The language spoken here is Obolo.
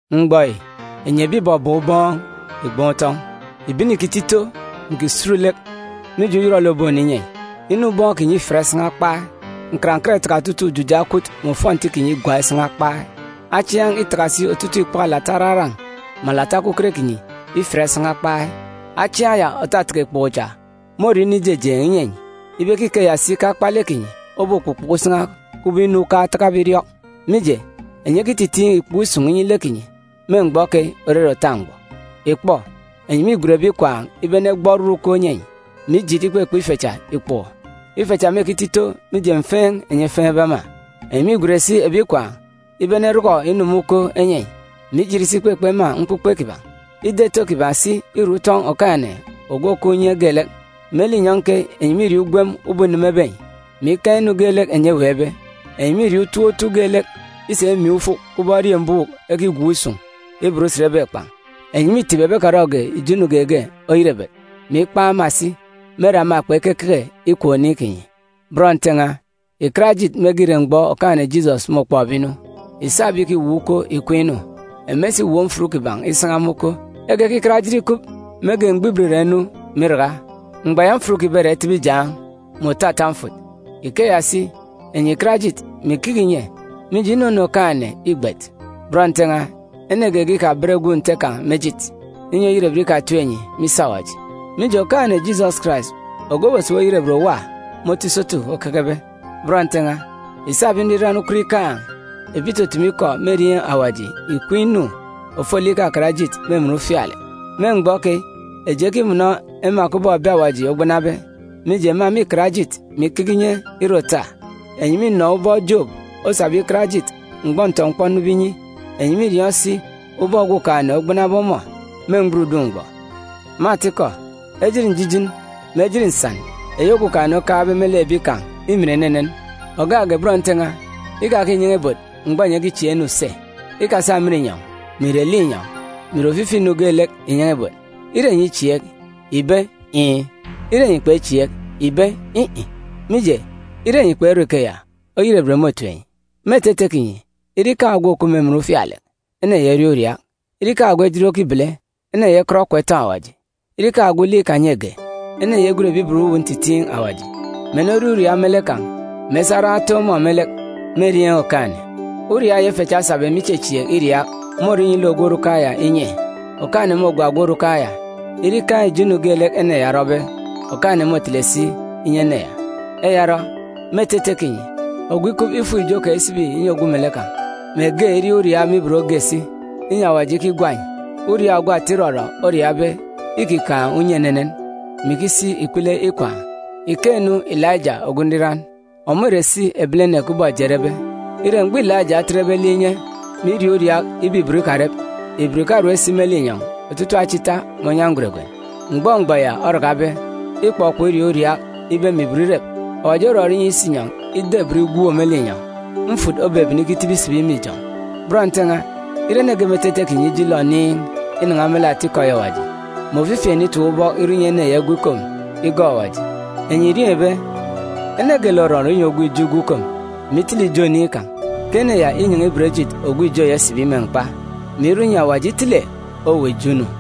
Mgbọ yi, enyi ebi ìbọbọọn̄ ubọọn̄, ìgban̄ utọn̄! Ìbene ìkito ito, mè ìkisut lek, mije uyọrọlek òbonu inyi enyi. Inu ubọọn̄ kinyi îfiat isan̄a kpai. Nkarankat îtaka otutuuk ujuja ekwut mè ofọnti kinyi igwak isan̄a kpai. Achiaan̄ îtaka si otutuuk ikpoko alata araran̄ mè alata okuket kinyi ifiat isan̄a kpai. Achiaan̄ ya òtataka ikpoko cha môre inu ijejeen̄ inyi enyi, ibe ke ikeya si ke akpalek kinyi obokpukpuku isan̄a, kubọk inu ukan̄ otakabe iriọk. Mije, enyi ekititiin̄ ikpoko isun̄ inyi lek kinyi me mgbọ keyi òrere òta mgbọ. Ìkpọ, enyi mîgwen ebi ikwaan̄ ibe enegbọ oron uko enyi enyi, mè ijit ikpekpe ife cha ikpoko. Ife cha mêkito ito, mije mfeen̄ enyi efeen̄be ema. Enyi mîgwen si ebi ikwaan̄ ibe enerọkọ inu me uko enyi enyi, mè ijit si ikpekpe ema mkpukpe kiban̄. Ida ito kiban̄ si îre utọn̄ Okumugwem Ogwukaan̄ Inyọn̄ mè Ijọn̄. Me linyọn̄ keyi, enyi mîrie ugwem ubọk înemebe enyi, mè ikaan̄ inu geelek enyi eweekbe. Enyi mîrie utop otu geelek isa imiin̄ ufuk kubọk eriembuuk ekigwook isun̄ iban usen ebekpan̄. Enyi mîtip ebi ekarọge ijo inu geege oyerebet, mè ikpan̄ ema si, me ere ema kpekekeke ìkwek oniin̄ kinyi. Bọn Nte n̄a, ìkat ejit mege ìre mgbọ Okaan̄-ene Jisọs môkpọkbe inu. Ìsa ebi ìkiwop uko ìkween̄ inu. Ema isiwop mfut kiban̄ isan̄a me uko, ekekikat ejit ikup mege, mgbọ ibot îra inu, mè iraka. Mgbọ ya, mfut kiban̄ îra itibi ijaan̄, mè òto ata mfut. Ikeya si, enyi ìkat ejit, mè ìkeke ìnye, mije, inunu Okaan̄-ene îgbet. Bọn Nte n̄a, ene geege ikaben gwun̄ Nte kan̄ me ejit, inyi oyerebet ikatip enyi me isi Awaji. Mije, Okaan̄-ene Jisọs Karais, ogwu òbosibi oyerebet òwa me otu isotu okekebe. Bọn Nte n̄a, ìsa ebi nriran ukot ikaan̄, ebi ìtutumu ikọ me erieen̄ Awaji, ìkween̄ inu ofolek ikakat ejit me emen ufialek. Me mgbọ keyi, eji ekimọnọ ema kubọk ebi Awaji ogbanabe, mije, ema mîkat ejit, mè ikeke inye ire òta. Enyi mînọ ubọk Jobu osabe ikat ejit mgbọ ntọ-mkpọ onube inyi. Enyi mîriọọn̄ si ubọk Okumugwem ogbanabe ọmọ me mgburudun̄ mgbọ. Me atikọ, ejit njijin, mè ejit nsan eyi Okumugwem okaan̄be me lek ebi kan̄ îmin enenen. Ògak ge, bọn Nte n̄a, ikakinyan̄a ibot mgbọ enyi ekichieek ene use. Ikasa emen inyọn̄, mè ìre linyọn̄, mè ìre ofifi inu geelek ìnyan̄a ibot. Iin̄ kinyi ire iin̄! In̄-in̄ kinyi ire si in̄-in̄! Mije, ire enyi kperọ ikeya, oyerebet môtip enyi. Me etete kinyi, ire ikaan̄ ogwu òkup me emen ufialek, ene ya iriaak uriaak. Ire ikaan̄ ogwu ejit okibele, ene ya ikọt okwa itọn̄ Awaji. Ire ikaan̄ ogwu lek ikanyege, ene ya igwen ebi ibot uwu ntitiin̄ Awaji, mè eneriaak uriaak me lek kan̄, mè esa aran̄ etoon̄ ọmọ me lek me erieen̄ Okaan̄-ene. Uriaak ya ife cha esabe me ichechieek iriaak môrọ inyi lek ogwu orukan̄ ya inye. Okaan̄-ene môgwa ogwu orukan̄ ya. Ire ikaan̄ ijo inu geelek ene ya orọbe, Okaan̄-ene môtele si inyi ene ya. Eya orọ, me etete kinyi, ogwu ikup, ifuk ijo kan̄ isibi inyi ogwu melek kan̄, mè ge iriaak uriaak me ibot ge si, inyi Awaji ikigwa enyi. Uriaak ogwu ata irọrọ oriaakbe îkikaan̄ unye enenen, mè ikisi si ikpele ikwaan̄. Ìkeek-nu Ilaija ogwu nriran. Ọmọ ìre si ebilene kubọk eji erebe. Ire, mgbọ Ilaija otetbe lek inye, mè iriaak uriaak ibe ibot ikarep, ibot ìkarep si me linyọn̄ otutuuk acha ita mè onyan̄ gweregwen. Mgbọ mgbọ ya orakabe, ikpọkpọk iriaak uriaak ibe mè ibot irep. Awaji orọrọ inyi isinyọn̄ ida ibot igwook me linyọn̄. Mfut obebene ikitibi isibi me ijọn̄. Bọn Nte n̄a, ire ene ge me etete kinyi ije ilọ oniin̄ inan̄a me lek atikọ eyi Awaji, mè ofifi ene itap ubọk irọ inyi ene ya igwu ikom igọọk Awaji, enyi ìriọọn̄ ibe, ene geelek òrọrọ inyi ogwu ijo igwu ikom, mè itele ijo oniin̄ kan̄, ke ene ya înyan̄a ibot ejit ogwu ijo ya isibi me mkpa, mè irọ inyi Awaji itele owuwa ijo inu.